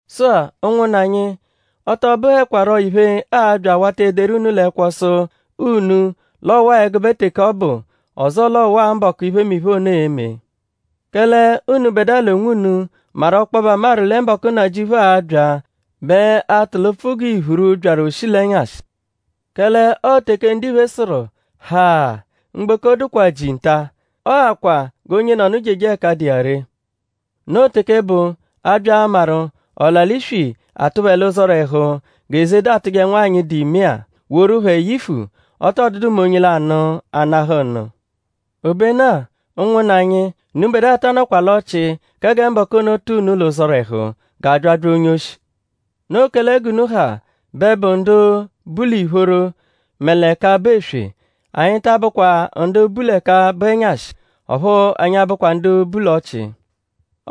Sụ-a; ụnwunna anyi; ọ tọ bụhekwaro iphe, aa-bya awata ederu unu l'ẹkwo sụ unu l'ọ waa ẹgube teke ọ bụ; ọzoo l'ọ waa mbọku, iphemiphe ono e-me. Kẹle unubẹdua l'onwunu maru ọkpobe amaru lẹ mbọku, Nnajịuphu a-bya bẹ a-tụ l'ụpfu g'iphuru, byaru oshi l'ẹnyashi. Kẹle ọo teke ndiphe sụru: “Ha! Mgboko dụkwaa jii nta; ọo akwa g'onyenọnu jeje ẹka dụ iya ree.” Noo teke bụ; a -bya amaru ọla-l'iswi atụ phẹ l'ụzorehu g'ezeda atụje nwanyị, dụ ime-a; woru phẹ yifu; ọ tọ dụdu mẹ onye lanụ anahụ nụ. Obenu-a; ụnwunna anyi; unubẹdua ta anọkwa l'ọchii kẹ gẹ mbọku ono tụ unu l'ụzorehu g'abyabya onye-oshi. Noo kẹle g'unu ha bẹ bu ndu bu l'ìphóró mẹ l'ẹka bụ eswe. Anyi ta abụkwa ndu bu l'ẹka bụ ẹnyashi; ọphu anyi abụkwa ndu bu l'ọchii.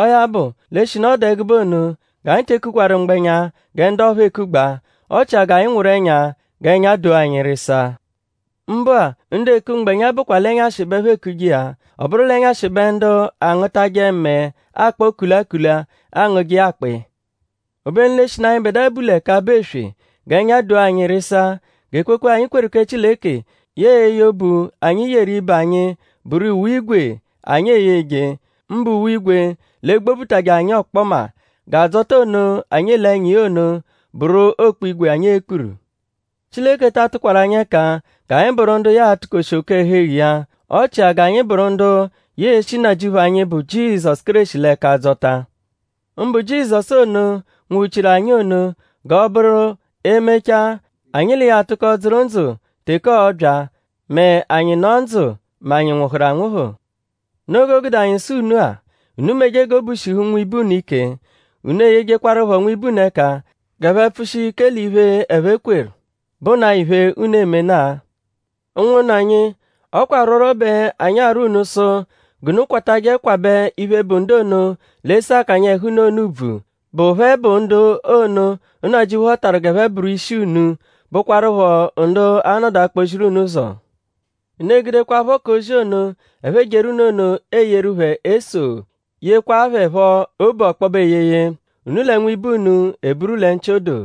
Ọo ya bụ; l'eshinu ọ dụ ẹgube ono; g'anyi te kukwaru mgbẹnya gẹ ndu ọphuu ekugbaa. Ọ chia g'anyi nwụru ẹnya; g'ẹnya doo anyi rịsaa. Mbụ-a; ndu eku mgbẹnya bụkwa l'ẹnyashi bẹ ẹphe ekuje iya. Ọ bụru l'ẹnyashi bẹ ndu angụtaje mẹe akpọ kulakula angụje iya akpọ iya. Obenu l'eshinu anyịbedua bu l'ẹka bụ eswe; g'ẹnya donaa anyi rịsaa. G'ekwekwe, anyi kweru kẹ Chileke yẹe eye obu, anyi yeru ibe anyi bụru uwe-ígwè, anyi e-yeje; mbụ uwe-ígwè, l'egbobutajẹ anyi ọkpoma. G'adzọta ono, anyi ele ẹnya iya ono bụru okpu-ígwè, anyi e-kpuru. Chileke ta atụkwaru anyi ẹka g'anyi bụru ndu ya a-tukoshi oke-ẹhu-eghu iya. Ọ chikwa g'anyi bụru ndu ya e-shi Nnajịuphu anyi, bụ Jizọsu Kéreshi l'ẹka dzọta. Mbụ Jizọsu ono, nwụhu-chiru anyi ono; g'ọo-bụru e -mechaa; anyi l'iya atụko dzụru ndzụ teke ọo-bya; mẹ anyi -nọ ndzụ; mẹ anyi -nwụhuru anwụhu. Noo g'o gude anyi sụ unu-a; unu meje g'obu shihu nwibe unu ike. Unu eyejekwaruphọ nwibe unu ẹka g'ẹphe pfụshia ike l'iphe, ẹphe kweru, bụnaa iphe, unu emena-a. Ụnwunna anyi; ọ kwa arwọrwo bẹ anyi arwọ unu sụ g'unu kwatajẹ kwabẹ iphe, bụ ndu ono, l'ese akanya ẹhu unu ono ùbvù, bụ phẹ bụ ndu ono, Nnajịuphu họtaru g'ẹphe bụru ishi unu; bụkwarupho ndu a-nọdu akpọ-ziru unu ụzo. Unu egudekwaphọ k'ozi ono, ẹphe ejeru unu ono eyeru phẹ eso; yekwaa phẹ phọ obu ọkpobe eyeye. Unu l'ibe unu eburu lẹ nchị odoo.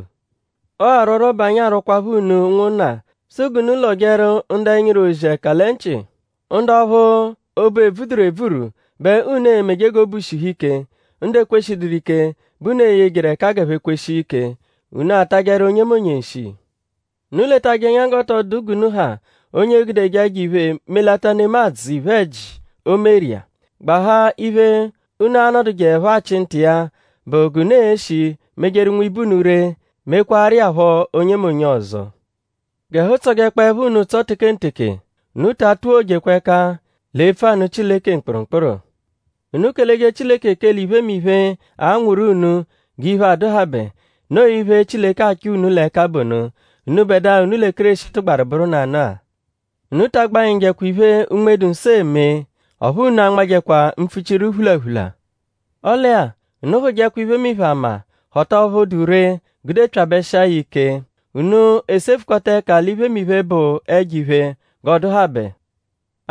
Ọo arwọrwo bẹ anyi arwọkwapho unu ụnwunna; sụ g'unu lọjeru ndu ẹnyiru-ozi ẹka lẹ nchị. Ndu ọphu obu ebvuduru ebvuru bẹ unu e-meje g'obu shihu ike. Ndu ekweshiduru ike bẹ unu eyejeru ẹka g'ẹphe kweshia ike. Unu atajẹru onyemonye nshi. Unu letajẹ ẹnya g'ọ tọ dụ g'unu ha onye e-gudeje ẹjo-iphe melata nemadzụ iphe-ẹji, o meru iya. Gbahaa iphe, unu a-nọdujeepho achị nta iya bụ g'unu e-shi mejeru nwibe unu ree; mekwaaru iya phọ onyemonye ọzo. G'ẹhu tsọjekpoepho unu ụtso tekenteke. Unu ta atuwojekwa ẹka l'epfu anụ Chileke mkpụrumkpuru. Unu keleje Chileke ekele iphemiphe, anwụru unu g'iphe adụhabe. Noo iphe, Chileke achọ unu l'ẹka bụ ono; unubẹdua, unu lẹ Kéreshi tụgbaru bụru nanụ-a. Unu ta agbanyịjekwa iphe, Unme-dụ-Nsọ eme. Ọphu unu anmajẹkwa mpfuchiru phulaphula. Ọle-a; unu hụjekwa iphemiphe ama; họta ọphu dụ ree; gudepyabẹshia ya ẹka ike. Unu esefukọta ẹka l'iphemiphe, bụ ẹjo-iphe g'ọ dụhabe.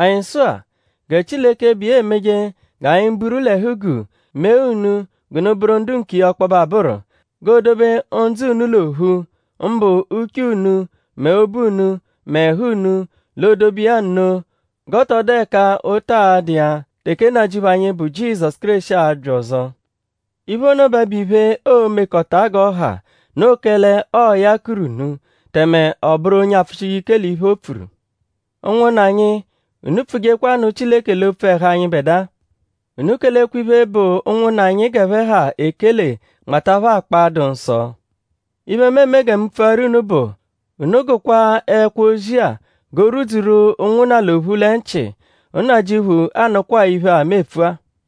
Anyi sụ-a; gẹ Chileke, bụ iya emeje g'anyi buru l'ẹhu-guu mee unu g'unu bụru ndu nkiya ọkpobe abụru. G'o dobe ndzụ unu l'ophu; mbụ uche unu mẹ obu unu mẹ ẹhu unu; l'o dobe iya nno g'ọ tọ dụ ẹka ụta a-dụ iya teke Nnajịuphu anyi, bụ Jizọsu Kéreshi a-bya ọzo. Iphe ono bẹ bụ iphe, oo-mekọta g'ọ ha; noo kẹle ọo ya kuru unu; tẹme ọ bụru onye apfụshije ike l'iphe, o pfuru. Ụnwunna anyi; unu pfujekwa nụ Chileke l'opfu ẹhu anyịbedua. Unu kelekwa iphe, bụ ụnwunna anyi g'ẹphe ha ekele nmata phẹ akpa, dụ nsọ. Iphe, mu eme gẹ mu pfuaru unu bụ; unu gụkwaa ẹkwo-ozi-a g'o rwudzuru ụnwunna l'ophu lẹ nchị. Nnajịuphu anụkwaa iphe-a, mu epfu-a.